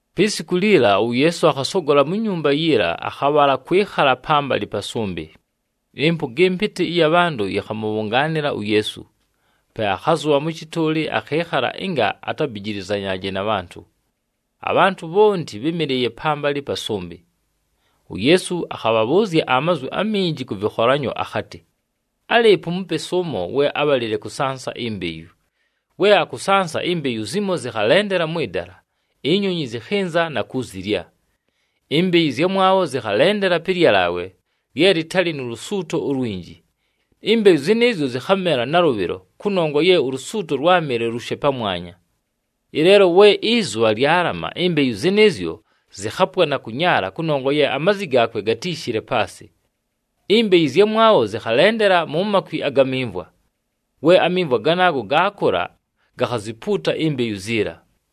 Pi siku liliila, uYeesu akhasogola mu nyumba yiila, akhabhala kwɨkhala pambalɨ pa sʉmbɨ. Ɨmpʉga ɨmpɨtɨ ɨya bhantʉ yɨkhamʉbhʉngaanɨla uYeesu. Pe akhazʉbha mʉ shɨtʉʉlɨ, akhɨɨkhala ɨnga atabijilizanyaaje na bhantʉ. Abhantʉ bhonti bhɨ́mɨlɨɨye pambalɨ pa sʉmbɨ. UYeesu akhabhabhʉʉzya amazwi aminji kʉ vɨkholanyo akhatɨ, “Álɨɨpo umupesi ʉmo we ábhalile kʉsansa imbeyu. We akʉsansa, imbeyu zimo zɨkhalendela mwɨ dala, inyonyi zɨkhɨnza na kuzilya. Imbeyu ɨzyamwabho zɨkhalendela pɨ lyalaawe lye lɨtalɨ nu lusuuto ulwinji, imbeyu zɨnɨɨzyo zɨkhamela nalʉbhɨlo kʉnongwa ye ulusuuto lwámɨle lushe pamwanya. Ɨleelo we ɨzʉbha lyalama, imbeyu zɨnɨɨzyo zɨkhapwa na kʉnyaala kʉnongwa ye amazi gaakwe gatíishile paasɨ. Imbeyu ɨzyamwabho zɨkhalendela mu makwi aga mimvwa. We amimvwa ganaago gaakʉla, gakhazipuuta imbeyu ziila.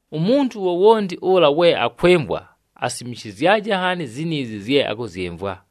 Umuntu wowonti ʉla we akwɨmvwa, asimishizyaje nhaani ziniizi zye akʉzyɨmvwa!”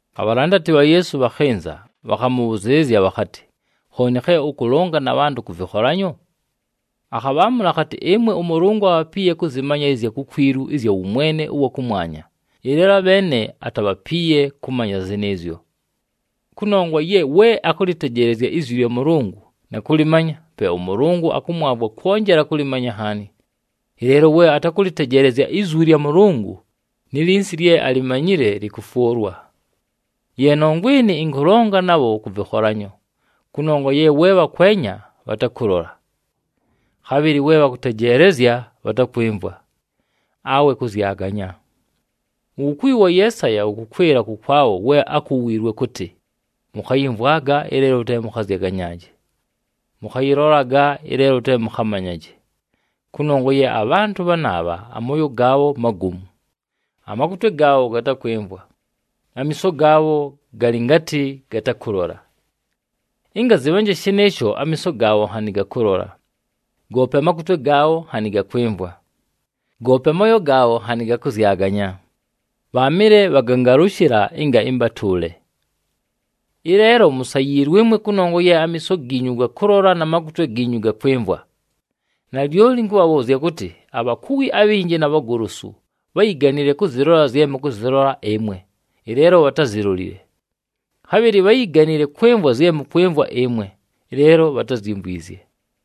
Abhalandati bha Yeesu bhakhɨnza, bhakhamʉbhʉzɨɨlɨzya bhakhatɨ, “Khooni khe ʉkʉlonga na bhantʉ kʉ vɨkholanyo?” Akhabhaamʉla akhatɨ, “Ɨmwe ʉMʉlʉngʉ abhapiiye kʉmanya ɨzya kukwilu ɨzya wʉmwene ʉwa kʉmwanya, ɨleelo abheene atabhapiiye kʉmanya zɨnɨɨzyo. Kʉnongwa ye we akʉlɨtejeelezya izwi lya Mʉlʉngʉ na kʉlɨmanya, pe ʉMʉlʉngʉ akʉmwavwa kwonjela kʉlɨmanya nhaani. Ɨleelo we atakʉlɨtejeelezya izwi lya Mʉlʉngʉ, ni linsi lye alimanyile lɨkʉfwʉlwa. Ye nongwa ɨnɨ, ɨnkʉlonga nabho kʉ vɨkholanyo, kʉnongwa ye we bhakwenya, bhatakʉlola. Khabhɨlɨ we bhakʉtejeelezya, bhatakwɨmvwa, awe kʉzyaganya. Uwukuwi wa Yeesaya wʉkʉkwɨla kʉkwabho we ákuwiilwe kʉtɨ, ‘Mʉkhayɨmvwaga, ɨleelo te mʉkhazyaganyaaje. Mʉkhayɨlolaga, ɨleelo te mʉkhamanyaje. Kʉnongwa ye abhantʉ bhanaabha amooyo gaabho magomu, amakutwe gaabho gatakwɨmvwa, amiiso gaabho galɨ ngatɨ gatakʉlola. Ɨnga zɨtabhanje shɨnɨɨsho, amiiso gaabho nhanɨ gakʉlola, goope amakutwe gaabho nhanɨ gakwɨmvwa, goope amooyo gaabho nhanɨ gakʉzyaganya, bhaamɨle bhagangalʉshɨla, ɨnga ɨmbatʉʉle.’ “Ɨleelo musayiilwe ɨmwe, kʉnongwa ye amiiso giinyu gakʉlola na makutwe giinyu gakwɨmvwa. Nalyoli ɨnkʉbhabhʉʉzya kʉtɨ, abhakuwi abhinji na bhagolosu bháyiganile kʉzɨlola zye mʉkʉzɨlola ɨmwe, ɨleelo bhatázilolile. Khabhɨlɨ bháyiganile kwɨmvwa zye mʉkwɨmvwa ɨmwe, ɨleelo bhatázyimvwizye.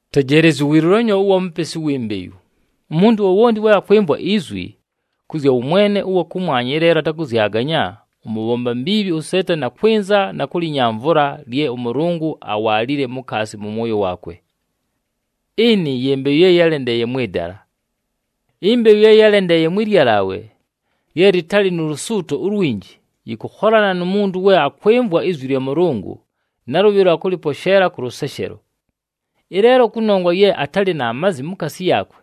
“Tejeelezyi uwilulanyo ʉwa mupesi uwi mbeyu. Umuntu wowonti we akwɨmvwa izwi kʉ zya wʉmwene ʉwa kʉmwanya, ɨleelo atakʉzyaganya, ʉmʉbhomba mbiibhi uSeetani akwɨnza na kʉlɨnyamvʉla lye ʉMʉlʉngʉ awaalile mukaasi mʉ mwoyo waakwe. Ɨnɨ ye mbeyu ye yálendeeye mwɨ dala. Imbeyu ye yálendeeye mwɨ lyalaawe lye lɨtalɨ nu lusuuto ulwinji, yɨkʉkholana nu muntu we akwɨmvwa izwi lya Mʉlʉngʉ, nalʉbhɨlo akʉlɨposheela kʉ lʉseshelo. Ɨleelo kʉnongwa ye atalɨ na mazi mukaasi yaakwe,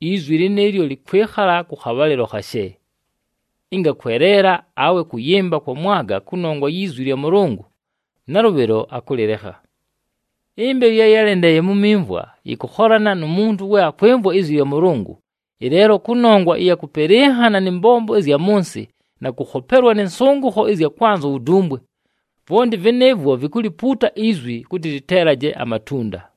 izwi lɨnɨɨlyo lɨkwɨkhala kʉ khabhalɨlo khashe. Ɨnga kweleela awe kʉyɨmba kwamwaga kʉnongwa yi zwi lya Mʉlʉngʉ, nalʉbhɨlo akʉlɨlekha. Imbeyu ye yálendeeye mu mimvwa, yɨkʉkholana nu muntu we akwɨmvwa izwi lya Mʉlʉngʉ. Ɨleelo kʉnongwa ɨya kʉpɨlɨnhana nɨ mbombo ɨzya mʉ nsɨ na kʉkhopelwa nɨ nsʉngʉkho ɨzya kwanza uwudumbwe, vwonti vɨnɨɨvwo vikulipuuta izwi kʉtɨ lɨteelaje amatunda.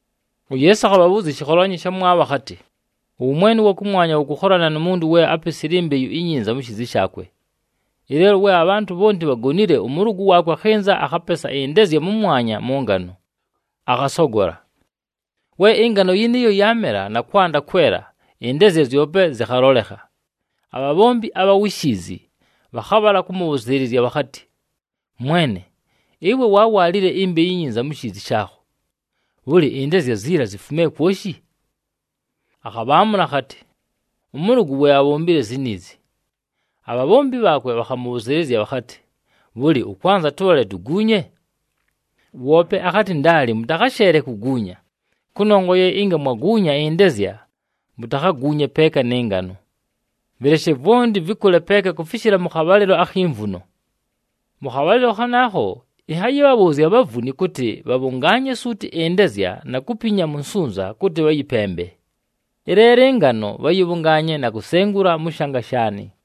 UYeesu akhabhabhʉʉzya ɨshɨkholanyo ɨshamwabho akhatɨ, “Ʉwʉmwene ʉwa kʉmwanya wʉkʉkholana nu muntu we ápesile imbeyu inyinza mu shiizi shaakwe. Ɨleelo we abhantʉ bhonti bhagonile, ʉmʉlʉgʉ waakwe akhɨnza akhapesa ɨndezya mʉmwanya mʉ ngano, akhasogola. We ɨngano yɨnɨɨyo yaamela na kwanda kwela, ɨndezya zyope zɨkhalolekha. Abhabhombi abha wi shiizi bhakhabhala kʉmʉbhʉzɨɨlɨzya bhakhatɨ, ‘Mwene, ɨwe waawaalile imbeyu inyinza mu shiizi shaakho. Bhʉlɨ, ɨndezya ziila zifumile kwoshi?’ Akhabhaamʉla akhatɨ, ‘Ʉmʉlʉgʉ we abhombile ziniizi.’ Abhabhombi bhaakwe bhakhamʉbhʉzɨɨlɨzya bhakhatɨ, ‘Bhʉlɨ, ʉkwanza tʉbhale tuguunye?’ Woope akhatɨ, ‘Ndaali, mʉtakhasheele kuguunya kʉnongwa ye ɨnga mwaguunya ɨndezya, mutakhaguunye peeka nɨ ngano. Vɨleshe vwonti vɨkʉle peeka kufishila mʉ khabhalɨlo akhi mvuno. Mʉ khabhalɨlo khanaakho, ɨnhayɨbhabhʉʉzya abhavuni kʉtɨ bhabhʉngaanye suuti ɨndezya na kupinya mu nsunza kʉtɨ bhayɨpembe. Ɨleelo ɨngano bhayɨbhʉngaanye na kusengula mʉ shanga shaanɨ.’”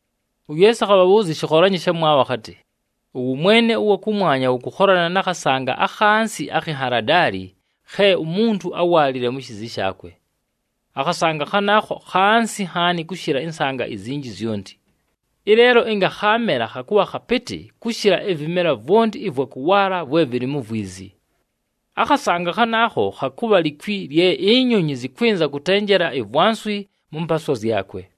UYeesu akhabhabhʉʉzya ɨshɨkholanyo ɨshamwabho akhatɨ, “Ʉwʉmwene ʉwa kʉmwanya wʉkʉkholana na khasanga akhansi akhi nhaladaali khe umuntu áwaalile mu shiizi shaakwe. Akhasanga khanaakho khansi nhaani kʉshɨla ɨsanga izinji zyonti, ɨleelo ɨnga khaamela khakʉbha khapɨtɨ kʉshɨla ɨvɨmela vwonti ɨvwa kʉwaala vwe vɨlɨ mu vwizi. Akhasanga khanaakho khakʉbha likwi lye inyonyi zɨkwɨnza kʉtenjela ivwanswi mʉ mpaaswa zyakwe.”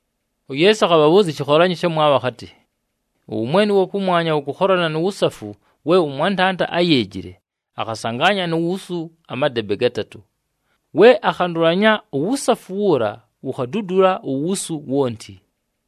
UYeesu akhabhabhʉʉzya ɨshɨkholanyo ɨshamwabho akhatɨ, “Ʉwʉmwene ʉwa kʉmwanya wʉkʉkholana nu wusafu we ʉmwantanda áyeejile, akhasangaanya nu wusu amadebe gatatʉ. We akhandʉlanya, uwusafu wuula wukhadudula uwusu wonti.”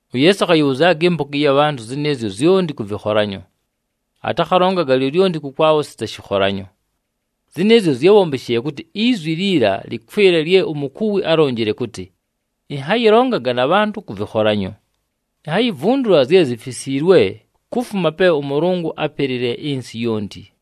UYeesu akhayɨbhʉzyaga ɨmpʉga ɨya bhantʉ zɨnɨɨzyo zyonti kʉ vɨkholanyo. Atakhalongaga lyolyonti kʉkwabho sita shɨkholanyo. Zɨnɨɨzyo zyábhombeshile kʉtɨ izwi liila lɨkwɨle lye umukuwi álonjile kʉtɨ, “Ɨnhayɨlonga na bhantʉ kʉ vɨkholanyo. Inhayivundula zye zifisiilwe kufuma pe ʉMʉlʉngʉ ápelile ɨnsɨ yonti.”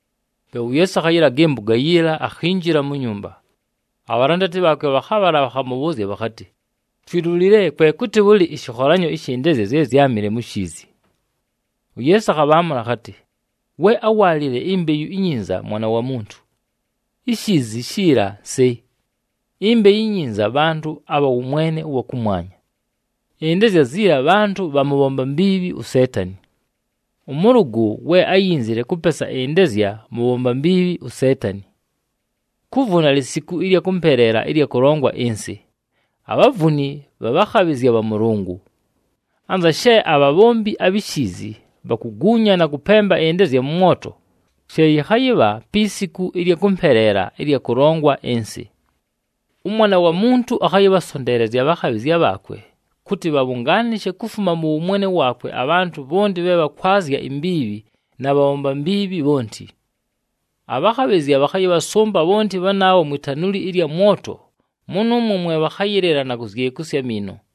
Pe uYeesu akhayɨlaga ɨmpʉga yiila, akhinjila mu nyumba. Abhalandati bhaakwe bhakhabhala, bhakhamʉbhʉʉzya bhakhatɨ, “Twilulile kwe kʉtɨ bhʉlɨ ɨshɨkholanyo ɨshɨ ndezya zye zyámɨle mu shiizi.” UYeesu akhabhaamʉla akhatɨ, “We áwaalile imbeyu inyinza Mwana wa Muntu. Ishiizi shiila nsɨ, imbeyu inyinza bhantʉ abha wʉmwene ʉwa kʉmwanya, ɨndezya ziila bhantʉ bha mʉbhomba mbiibhi uSeetani. Ʉmʉlʉgʉ we áyinzile kʉpesa ɨndezya mʉbhomba mbiibhi uSeetani. Kuvuna lisiku ɨlya kʉmpeleela ɨlya kʉlongwa ɨnsɨ, abhavuni bhabhakhabhɨzya bha Mʉlʉngʉ. Anza she abhabhombi abhi shiizi bhakuguunya na kʉpemba ɨndezya mʉ mwoto, she yɨkhayɨbha pi siku ɨlya kʉmpeleela ɨlya kʉlongwa ɨnsɨ. ɄMwana wa Muntu akhayɨbhasonteelezya abhakhabhɨzya bhaakwe kʉtɨ bhabhʉngaanɨshe kufuma mʉ wʉmwene waakwe abhantʉ bhonti bhe bhakwazya imbiibhi na bhabhomba mbiibhi bhonti. Abhakhabhɨzya bhakhayɨbhasʉmba bhonti bhanaabho mwi tanuli ɨlya mwoto, mʉnʉʉmwo mwe bhakhayɨlɨla, na kuzyekusya amiino.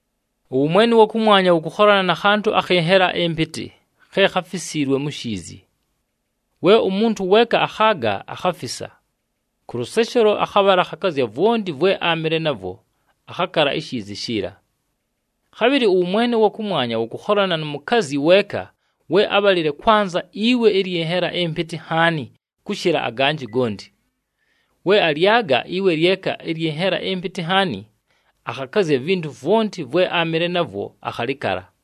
“Ʉwʉmwene ʉwa kʉmwanya wʉkʉkholana na khantʉ akhɨ nhela ɨmpɨtɨ khe kháfisiilwe mu shiizi. We umuntu weeka akhaaga, akhafisa. Kʉ lʉseshelo, akhabhala akhakazya vwonti vwe áamɨle navwo, akhakala ishiizi shiila. “Khabhɨlɨ ʉwʉmwene ʉwa kʉmwanya wʉkʉkholana nu mukazyi weeka we ábhalile kwanza iwe ɨlyɨ nhela ɨmpɨtɨ nhaani kʉshɨla aganjɨ gonti. We alyaga iwe lyeka ɨlyɨ nhela ɨmpɨtɨ nhaani, akhakazya ivintu vwonti vwe áamɨle navwo, akhalɨkala.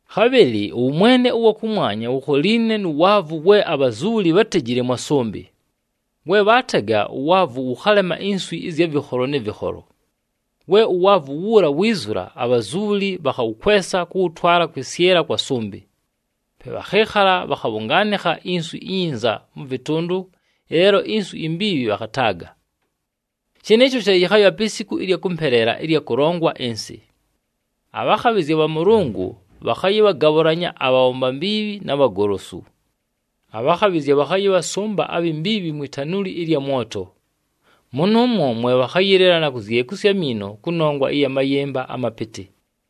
“Khabhɨlɨ ʉwʉmwene ʉwa kʉmwanya wukholiine nu waavu we abhazubhuli bhátejile mwa sʉmbɨ. We bhaatega, uwaavu wʉkhalema inswi ɨzya vɨkholo nɨ vɨkholo. We uwaavu wuula wiizula, abhazubhuli bhakhawʉkwesa kʉwʉtwala kwɨsyɨla kwa sʉmbɨ. Pe bhakhɨɨkhala bhakhabhʉngaanɨkha inswi inyinza mʉ vɨtʉndʉ, ɨleelo inswi imbiibhi bhakhataaga. Shɨnɨɨsho she yɨkhayɨbha pi siku ɨlya kʉmpeleela ɨlya kʉlongwa ɨnsɨ. Abhakhabhɨzya bha Mʉlʉngʉ bhakhayɨbhagabhʉlanya abhabhomba mbiibhi na bhagolosu. Abhakhabhɨzya bhakhayɨbhasʉmba abhi mbiibhi mwi tanuli ɨlya mwoto, mʉnʉʉmwo mwe bhakhayɨlɨla na kuzyekusya amiino kʉnongwa ya mayɨmba amapɨtɨ.”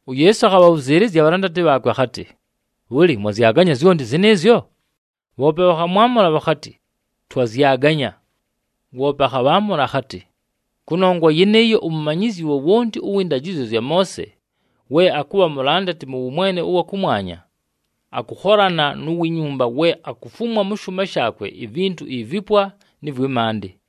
UYeesu akhabhabhʉzɨɨlɨzya abhalandati bhaakwe akhatɨ, “Bhʉlɨ, mwazyaganya zyonti zɨnɨɨzyo?” Bhoope bhakhamwamʉla bhakhatɨ, “Twazyaganya.” Woope akhabhaamʉla akhatɨ, “Kʉnongwa yɨnɨɨyo, umumanyizyi wowonti ʉwɨ ndajɨzyo zya Moose we akʉbha mulandati mʉ wʉmwene ʉwa kʉmwanya, akʉkholana nu wi nyumba we akufumwa mʉ shʉʉma shaakwe ivintu ivipwa nɨ vwɨ maandɨ.”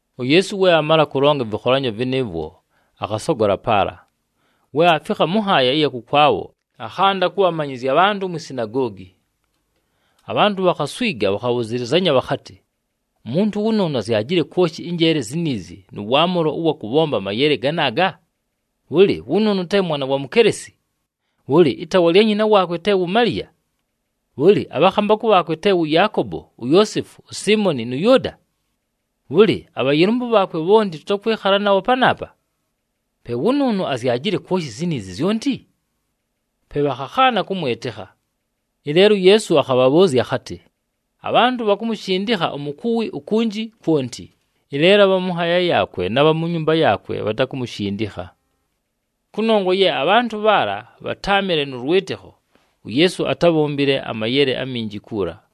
We uYeesu aamala kʉlonga ɨvɨkholanyo vɨnɨɨvwo, akhasogola paala. We aafikha mʉ nhaaya ɨya kʉkwabho, akhanda kʉbhamanyɨzya abhantʉ mwi sinagoogi. Abhantʉ bhakhaswiga bhakhabhʉzɨlɨzanya bhakhatɨ, “Umuntu wʉnʉʉnʉ azyajile kwoshi ɨnjeele ziniizi nʉ waamʉlo ʉwa kʉbhomba amayele ganaaga? Bhʉlɨ, wʉnʉʉnʉ te mwana wa mukelesi? Bhʉlɨ, ɨtaawa lya nyina waakwe te wu Maliya? Bhʉlɨ, abhakhambakʉ bhaakwe te wʉ Yaakobo, uYoosefu, uSiimoni nʉ Yʉʉda? Bhʉlɨ, abhayɨlʉmbʉ bhaakwe bhonti tʉtakwɨkhala nabho panaapa? Pe wʉnʉʉnʉ azyajile kwoshi ziniizi zyonti?” Pe bhakhakhaana kʉmwɨtɨkha. Ɨleelo uYeesu akhabhabhʉʉzya akhatɨ, “Abhantʉ bhakumushindikha umukuwi ukunji kwonti, ɨleelo abha mʉ nhaaya yaakwe na bha mu nyumba yaakwe bhatakumushindikha.” Kʉnongwa ye abhantʉ bhaala bhatáamɨle nʉ lwɨtɨkho, uYeesu atábhombile amayele aminji kuula.